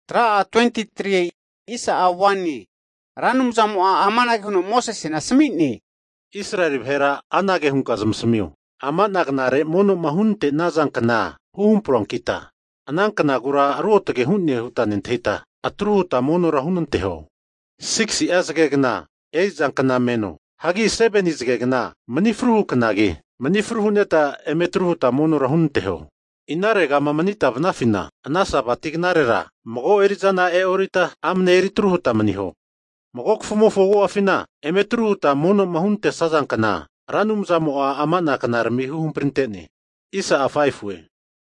Ra Anumzamo'a amange huno Mosesena asami'ne, Israeli vahera anage hunka zamasamio, ama'na knare mono'ma hunante'naza kna huhampruankita, ana knagura ruotage hu'ne huta nentahita atru huta monora hunanteho. Sigisi'a zagegna eri'za kna meno, hagi 7ni zagegna manifru knagi mani fru hu'neta eme atru hutma monora hunanteho. Inaregama manita vanafina ana Sabati knarera mago eri'zana e'orita, amane eritru huta maniho. Mago kafumofo agu'afina eme atruma huta mono'ma huntesazankna Ra Anumzamo'a ama'na knarami huhamprinte'ne.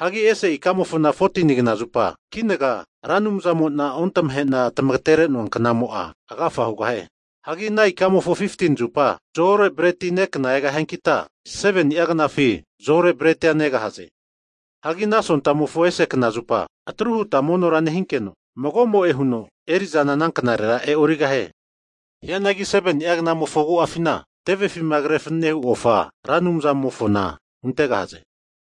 Hagi ese ikamofona 14nigna zupa kinaga Ra Anumzamo'na Ontamahena tamagatere'noa knamo'a agafa hugahie. Hagi ana ikamofo 15ni zupa zo-ore bretima nekna egahiankita, 7ni'a knafi zo-ore bretia negahaze. Hagi ana sontamofo ese kna zupa atru huta monora nehinkeno mago'mo'e huno eri'zana ana knarera e'o'rigahie. Hianagi 7ni'a knamofo agu'afina tevefima kre fananehu ofa Ra Anumzamofona huntegahaze.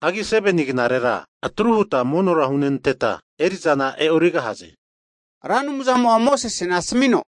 Hagi 7ni knarera atru huta monora hunenteta erizana e'origahaze. Ra Anumzamo'a Mosesena asamino,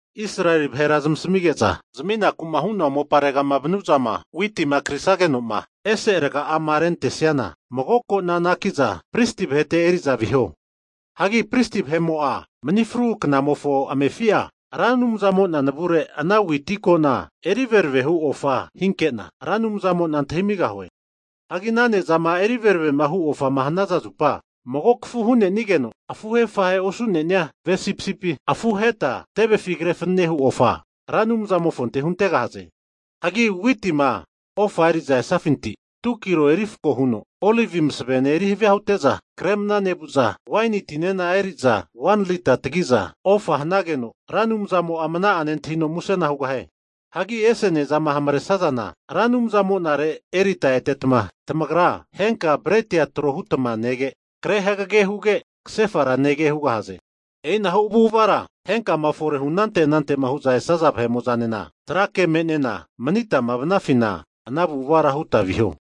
Israeli vahera zamasamige'za, zaminaku'ma hu'noa mopare'ma vanu'zama witima krisage'noma ese raga'ama rentesiana, mago kona anaki'za pristi vahete eri'za viho. Hagi pristi vahe'mo'a mani fru knamofo amefi'a, Ra Anumzamo'na navure ana witi kona eri veravehu ofa hinke'na, Ra Anumzamo'na antahimigahue. Hagi ana ne'zama eri veravemahu ofama hanaza zupa, mago kafu hu'nenigeno afuhe afahe osu'nenia ve sipisipi afu aheta tevefi kre fanenehu ofa Ra Anumzamofonte huntegahaze. Hagi witima ofa eri'za esafinti 2'a kilo erifako hu'za, olivi masavene erihavia hute'za kre mna nevu'za, waini tinena eri'za 1ni'a lita tagi'za ofa hanageno Ra Anumzamo'a mna'a nentahino musena hugahie. Hagi ese ne'zama hamaresazana Ra Anumzamonare erita etetma, tamagra henka breti tro hutma nege, kre hagage huge kasefara nege hugahaze. E'inahu avu'avara henkama fore hu'anante anantema hu'zama esaza vahe'mo'zanena trake me'nena manitama vanafina ana avu'avara huta viho.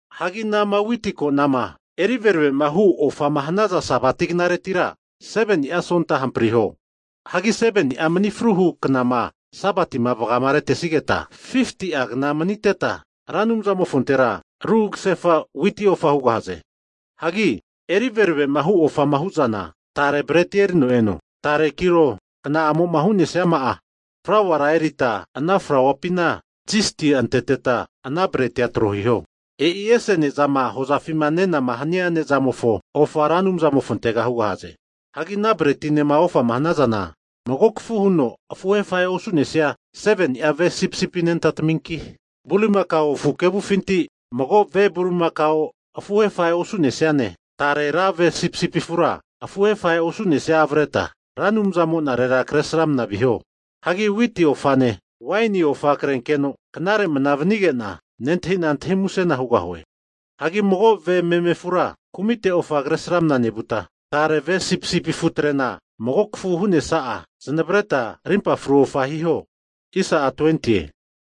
Hagi anama witi ko'nama eri veravemahu ofama hanazana Sabati knaretira 7ni'a sonta hampriho. Hagi 7ni'a mani fruhu knama Sabatima vagamaretesigeta, 50'a kna maniteta, Ra Anumzamofontera ru kasefa witi ofa hugahaze. Hagi eri veravema hu ofama hu'zana, tare bretia erino eno tare kilo kna'amo'ma hu'nesiama'a flauara erita ana flauapina zisti anteteta, ana bretia tro hiho. E'i ese ne'zama hozafima nenama hania ne'zamofo ofa Ra Anumzamofontega hugahaze. Hagi ana bretinema ofama hanazana, mago kafu huno afuhe afahe osu'nesia 7ni'a ve sipisipi anentataminki, bulimakao afu kevufinti mago ve bulimakao afuhe afahe osu'nesiane, tare ra ve sipisipi afutre afuhe afahe osu'nesia avreta Ra Anumzamo'narera kresramna viho. Hagi witi ofane, waini ofa krenkeno knare mana vanige'na nentahina antahi musena hugahue. Hagi mago ve meme afura kumite ofa kresramna nevuta, tare ve sipisipi afutrena mago kafu hu'nesa'a zanavreta arimpa fru ofa hiho.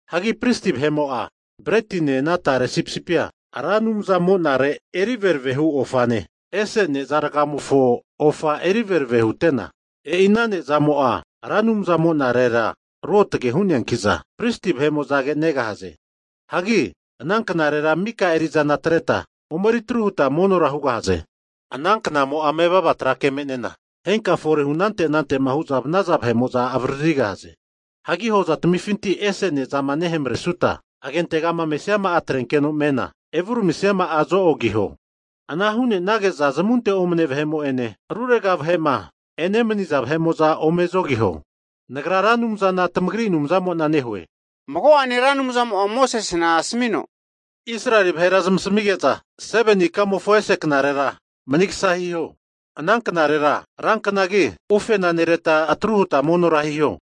Hagi Pristi vahe'mo'a bretine ana tare sipisipia Ra Anumzamo'nare eri verave hu ofane, ese ne'za rgamofo ofa eri verave hutena, e'i ana ne'zamo'a Ra Anumzamonarera ruotage hu'neankiza pristi vahe'mo'zage negahaze. Hagi ana knarera maka eri'zana atreta omeri atru huta monora hugahaze. Ana knamo'a mevava tra ke me'nena henkama fore hu anante anante hu'zama vanaza vahe'mo'za avaririgahaze. Hagi hozatamifinti ese ne'zama nehamaresuta, agentegama mesiama'a atrenkeno nemena, evuramisiama'a zo-ogiho. Ana hu'nenage'za zamunte omane vahe'ene rurega vahe'ma enemaniza vahe'mo'za ome zogiho. Nagra Ra Anumzana tamagri Anumzamo'na nehue. Mago'ane Ra Anumzamo'a Mosesena asmino, Israeli vahera zamasamige'za 7ni ikamofona ese knarera manigasa hiho. Ana knarera ranknatamigi ufena nereta atru huta monora hiho.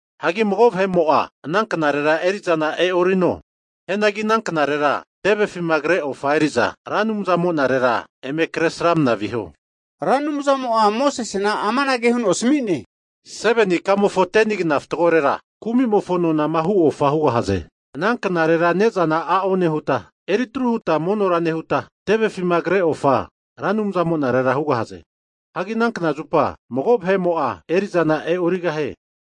Hagi mago vahe'mo'a ana knarera eri'zana e'orino. Hianagi ana knarera tevefima kre ofa eri'za Ra Anumzamo'nare eme kresramna viho. Ra Anumzamo'a Mosesena amanage huno asmi'ne, 7ni ikamofona 10ni kna fatgorera kumi'mofo nonama hu ofa hugahaze. Ana knarera ne'zana a'o nehutma, eritru huta monora nehuta tevefima kre ofa Ra Anumzamo'nare hugahaze. Hagi ana kna zupa mago vahe'mo'a eri'zana e'origahie,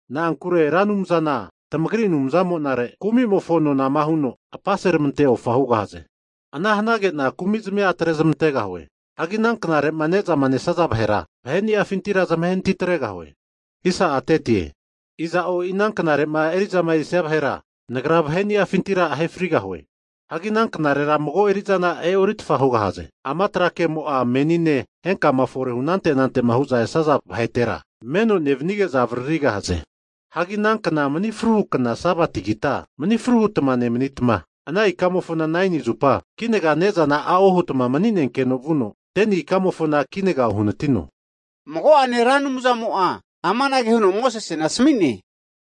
na'ankure Ra Anumzana tamagri Anumzamo'nare kumimofo nonama huno apaseramante ofa hugahaze. Ana hanage'na kumitamia atrezmantegahue. Hagi ana knare'ma ne'zama nesaza vahera vahe'niafintira zamahe anati atregahue. Iza'o e'i ana knare'ma eri'zama erisia vahera, Nagra vahe'niafintira ahe frigahue. Hagi ana knarera mago eri'zana e'oritfa hugahaze. Ama tra kemo'a menine henkanema fore hu anante anante hu'zama esaza vahetera meno nevanige'za avaririgahaze. Hagi anankna mani fruhu kna Sabatigita, mani fru hutma nemanitma, ana ikamofona 9ni zupa kinaga ne'zana a'o hutma mani'nenkeno vuno 10ni knamofona kinaga uhanatino. Mago'ene Ra Anumzamo'a amanage huno Mosesena asmi'ne,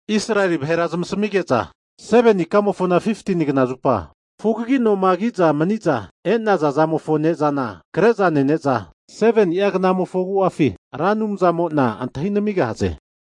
Israeli vahera zamasamige'za, 7ni ikamofona 15tini knazupa fugagi noma kiza maniza e'naza zamofo ne'zana kre'za nene'za, 7ni'a knamofo agu'afi Ra Anumzamo'na antahi namigahaze.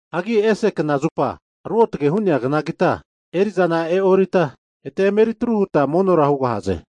Hagi ese kna zupa ruotage hu'nea knagita eri'zana e'orita eta emeri tru huta monora hugahaze.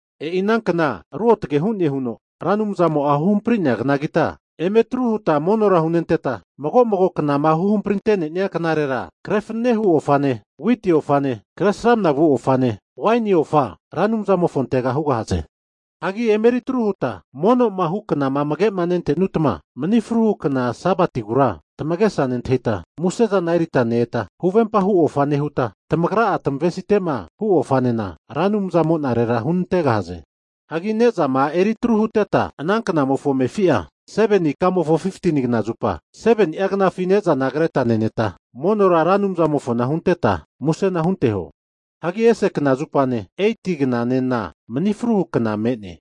E'i ana kna ruotage hu'ne huno Ra Anumzamo'a huhampri'nea knagita, eme atru huta monora hunenteta mago mago knama huhamprinte'nenia knarera kre fanane hu ofane, witi ofane, kresramna vu ofane, waini ofa Ra Anumzamofontega hugahaze. Hagi emeritru huta mono'ma hu knaramina amage'ma nente'nuta, mani fru hu kna Sabatigura tamagesa nentahita, muse'zana erita ne-eta, huvempa hu ofa nehuta, tamagra'a tamavesite'ma hu ofanena Ra Anumzamo'narera hunantegahaze. Hagi ne'zama eri tru huteta ana knamofo amefi'a, 7ni ikamofo 15ni knazupa 7ni'a knafi ne'zana kreta neneta monora Ra Anumzamofona hunteta musena hunteho. Hanki ese knazupane, 8ti knanena manifru hu kna me'ne.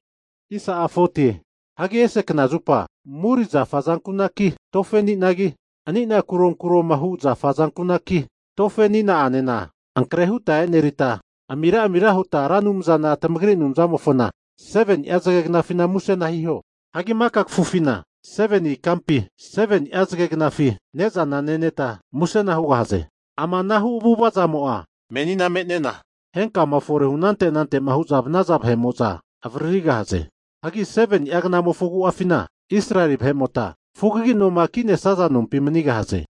Hagi ese kna zupa muri zafa azankunaki, tofe ani'nagi, ani'na kuronkuroma hu zafa azankunaki, ankre huta e'nerita, amiramira huta Ra Anumzana tamagri Anumzamofona 7ni'a zagegnafina musena hunanteho. Hagi maka kafufina 7ni ikampi 7ni'a zagegnafi ne'zana neneta musena hugahaze. Ama anahu avu'avazamo'a menina me'nena henkama fore'ma hu anante anante'ma hu'zama vanaza vahe'mo'za avririgahaze. Hagi 7ni'a knamofo agu'afina Israeli vahe'mota fugagi noma ki'nesaza nompi manigahaze.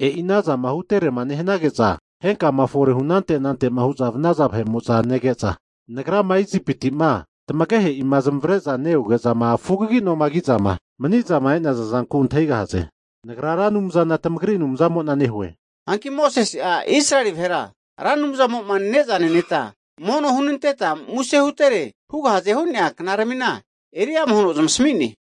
E'i anazama huterema nehanage'za henkama fore'ma hunante anante'ma hu'zama vanaza vahe'mo'za nege'za, Nagrama Isipiti'ma tamagehe'ima zamavare'na ne-eoge'zama fugagi'noma ki'zama maniza e'naza zanku antahigahaze. Nagra Ra Anumzana tamagri Anumzamo'na nehue. Hanki Mosese'a Israeli vahera Ra Anumzamo'ma ne'za neneta mono hunanteta muse hutere hugahazema hu'nea knaramina eriama huno zamasami'ne.